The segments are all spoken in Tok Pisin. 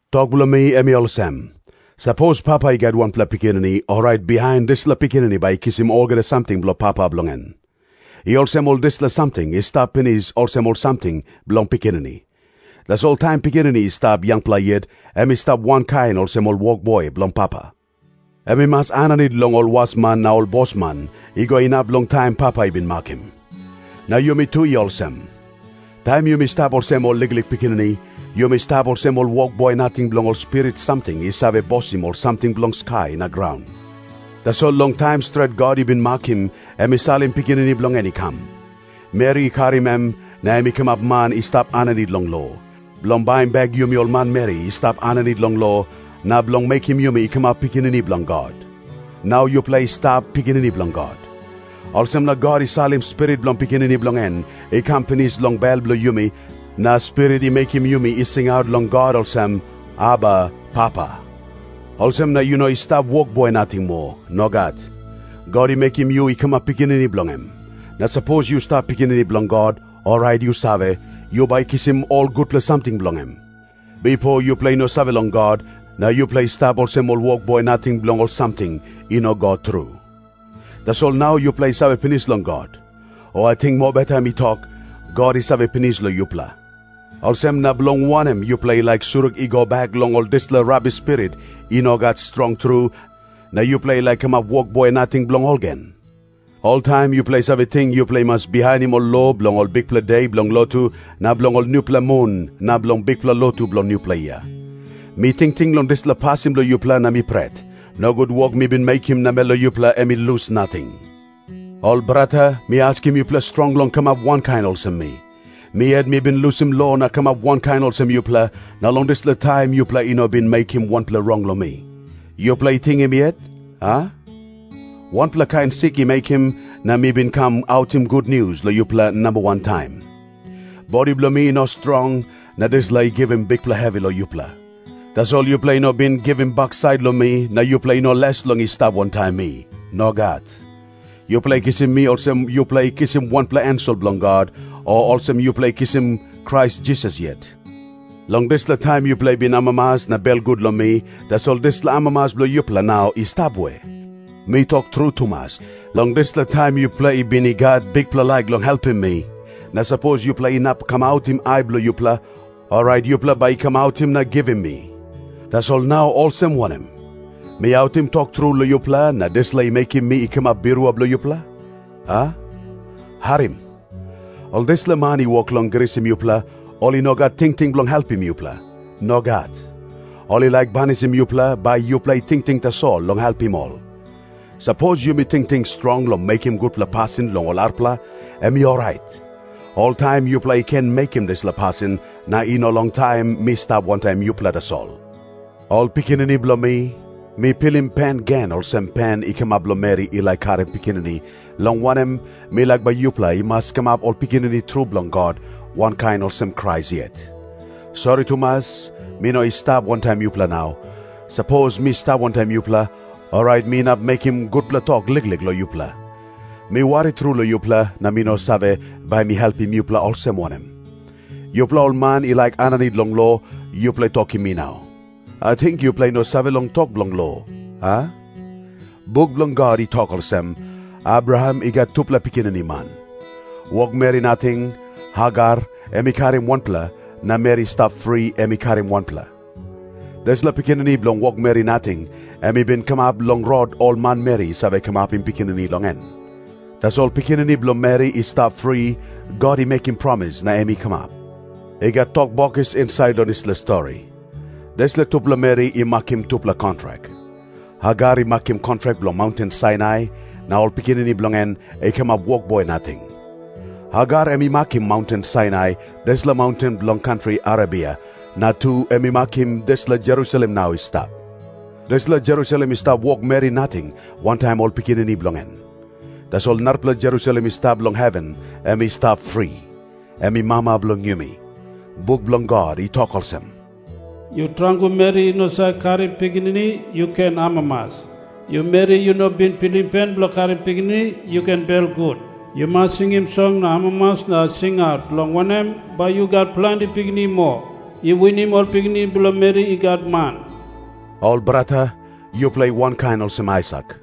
Tok bilong mi em i olsem. Sapos papa i gat wanpela pikinini, orait bihain dispela pikinini bai i kisim olgeta samting bilong papa bilong en. I olsem ol dispela samting i stap pinis olsem ol samting bilong pikinini. Tasol taim pikinini i stap yangpela yet, em i stap wankain olsem ol wokboi bilong papa. Em i mas aninit long ol wasman na ol bosman, i go inap long taim papa i bin makim. Na yumi tu i olsem. Taim yumi stap olsem ol liklik pikinini, yumi stap olsem ol wokboi nating bilong ol spirit samting i save bosim ol samting bilong skai na graun. Tasol long taim stret God i bin makim, em i salim Pikinini bilong en i kam. Meri i karim em, na em i kamap man i stap aninit long lo, bilong baim bek yumi ol manmeri i stap aninit long lo, na bilong mekim yumi i kamap pikinini bilong God. Nau yupela i stap pikinini bilong God. Olsem na God i salim Spirit bilong Pikinini bilong en i kam pinis long bel bilong yumi na Spirit i mekim yumi i singaut long God olsem, “Aba, Papa.” Olsem na yu no i stap wokboi nating moa. Nogat. God i mekim yu i kamap pikinini bilong em. Na sapos yu stap pikinini bilong God, orait yu save, yu bai kisim ol gutpela samting bilong em. Bipo yupela i no save long God, na yupela i stap olsem ol wokboi nating bilong ol samting i no god tru. Tasol nau yupela i save pinis long God. O ating mobeta mi tok, God i save pinis long yupela. Olsem na bilong wanem yupela i laik surik i go bek long ol dispela rabis spirit i no gat strong tru, na yupela i laik kamap wokboi nating bilong ol gen? Oltaim yupela i save ting yupela i mas bihainim ol lo bilong ol bikpela de bilong lotu na bilong ol nupela mun na bilong bikpela lotu bilong nupela yia. Mi tingting long dispela pasin bilong yupela na mi pret, nogut wok mi bin mekim namel long yupela em i lus nating. Ol brata, mi askim yupela strong long kamap wankain olsem mi. Mi yet mi bin lusim lo na kamap wankain olsem yupela, na long dispela taim yupela i no bin mekim wanpela rong long mi. Yupela i tingim yet, a? Wanpela kain sik i mekim, na mi bin kam autim gutnius long yupela namba wan taim. Bodi bilong mi i no strong, na dispela i givim bikpela hevi long yupela. Tasol yupela i no bin givim baksait long mi, na yupela i no les long i stap wantaim mi. Nogat. Yupela i kisim mi olsem yupela i kisim wanpela ensel bilong God, o olsem yupela i kisim Krais Jisas yet. Long dispela taim yupela i bin amamas na belgut long mi, tasol dispela amamas bilong yupela nau i stap we? Mi tok tru tumas, long dispela taim, yupela i bin i gat bikpela laik long helpim mi, na sapos yupela inap kamautim ai bilong yupela, orait yupela bai i kamautim na givim mi. Tasol nau olsem wanem? Mi autim tok tru long yupela, na dispela i mekim mi i kamap birua bilong yupela, a? Harim. Ol dispela man i wok long grisim yupela, ol i no gat tingting bilong helpim yupela. Nogat. Ol i laik banisim yupela, bai yupela i tingting tasol long helpim ol. Sapos yumi tingting strong long mekim gutpela pasin long ol arapela, em i orait. Oltaim yupela i ken mekim dispela pasin, na i no long taim mi stap wantaim yupela tasol. Ol pikinini bilong mi, mi pilim pen gen olsem pen i kamap long meri i laik karim pikinini, long wanem, mi laik bai yupela i mas kamap ol pikinini tru bilong God wankain olsem Krais yet. Sori tumas, mi no i stap wantaim yupela nau. Sapos mi stap wantaim yupela, orait mi inap mekim gutpela tok liklik long yupela. Mi wari tru long yupela, na mi no save, bai mi helpim yupela olsem wanem. Yupela ol man i laik aninit long lo, yupela tokim mi nau. Ating yupela i no save long tok bilong lo, a? Buk bilong God i tok olsem, Abraham i gat tupela pikinini man. Wokmeri nating, Hagar, em i karim wanpela, na meri i stap fri em i karim wanpela. Dispela pikinini bilong wokmeri nating, em i bin kamap long rot ol manmeri i save kamapim pikinini long en. Tasol pikinini bilong meri i stap fri, God i mekim promis na em i kamap. I gat tok bokis insait long dispela stori. Dispela tupela meri i makim tupela kontrak. Hagar i makim kontrak bilong maunten Sainai, na ol pikinini bilong en i kamap wokboi nating. Hagar em i makim maunten Sainai, dispela maunten bilong kantri Arebia, na tu em i makim dispela Jerusalem nau i stap. Dispela Jerusalem i stap wokmeri nating wantaim ol pikinini bilong en. Tasol narapela Jerusalem i stap long heven, em i stap fri. Em i mama bilong yumi. Buk bilong God i tok olsem, “Yu tarangu meri i no save karim pikinini, yu ken amamas. Yu meri, yu no bin pilim pen bilong karim pikinini, yu ken belgut. Yu mas singim song na amamas na singaut, long wanem, bai yu gat planti pikinini moa, i winim ol pikinini bilong meri i gat man.” Ol brata, yupela i wankain olsem Aisak.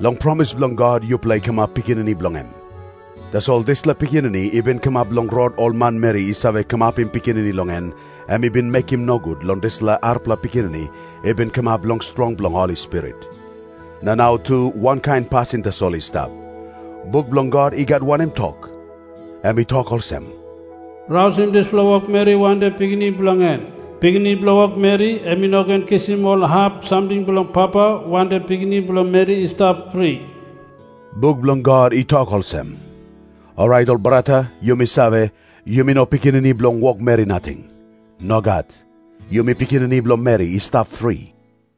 Long promis bilong God yupela i kamap pikinini bilong em. Tasol dispela pikinini i bin kamap long rot ol manmeri i save kamapim pikinini long en, em i bin mekim nogut long dispela arapela pikinini i bin kamap long strong bilong Holi Spirit. Na nau tu wankain pasin tasol i stap. Buk bilong God i gat wanem tok? Em i tok olsem, “Rausim dispela wokmeri wantaim pikinini bilong en. Pikinini bilong wokmeri em i no ken kisim ol hap samting bilong papa wantaim pikinini bilong meri i stap fri.” Buk bilong God i tok olsem. Orait ol brata, yumi save, yumi no pikinini bilong wokmeri nating. Nogat. Yumi pikinini bilong meri i stap fri.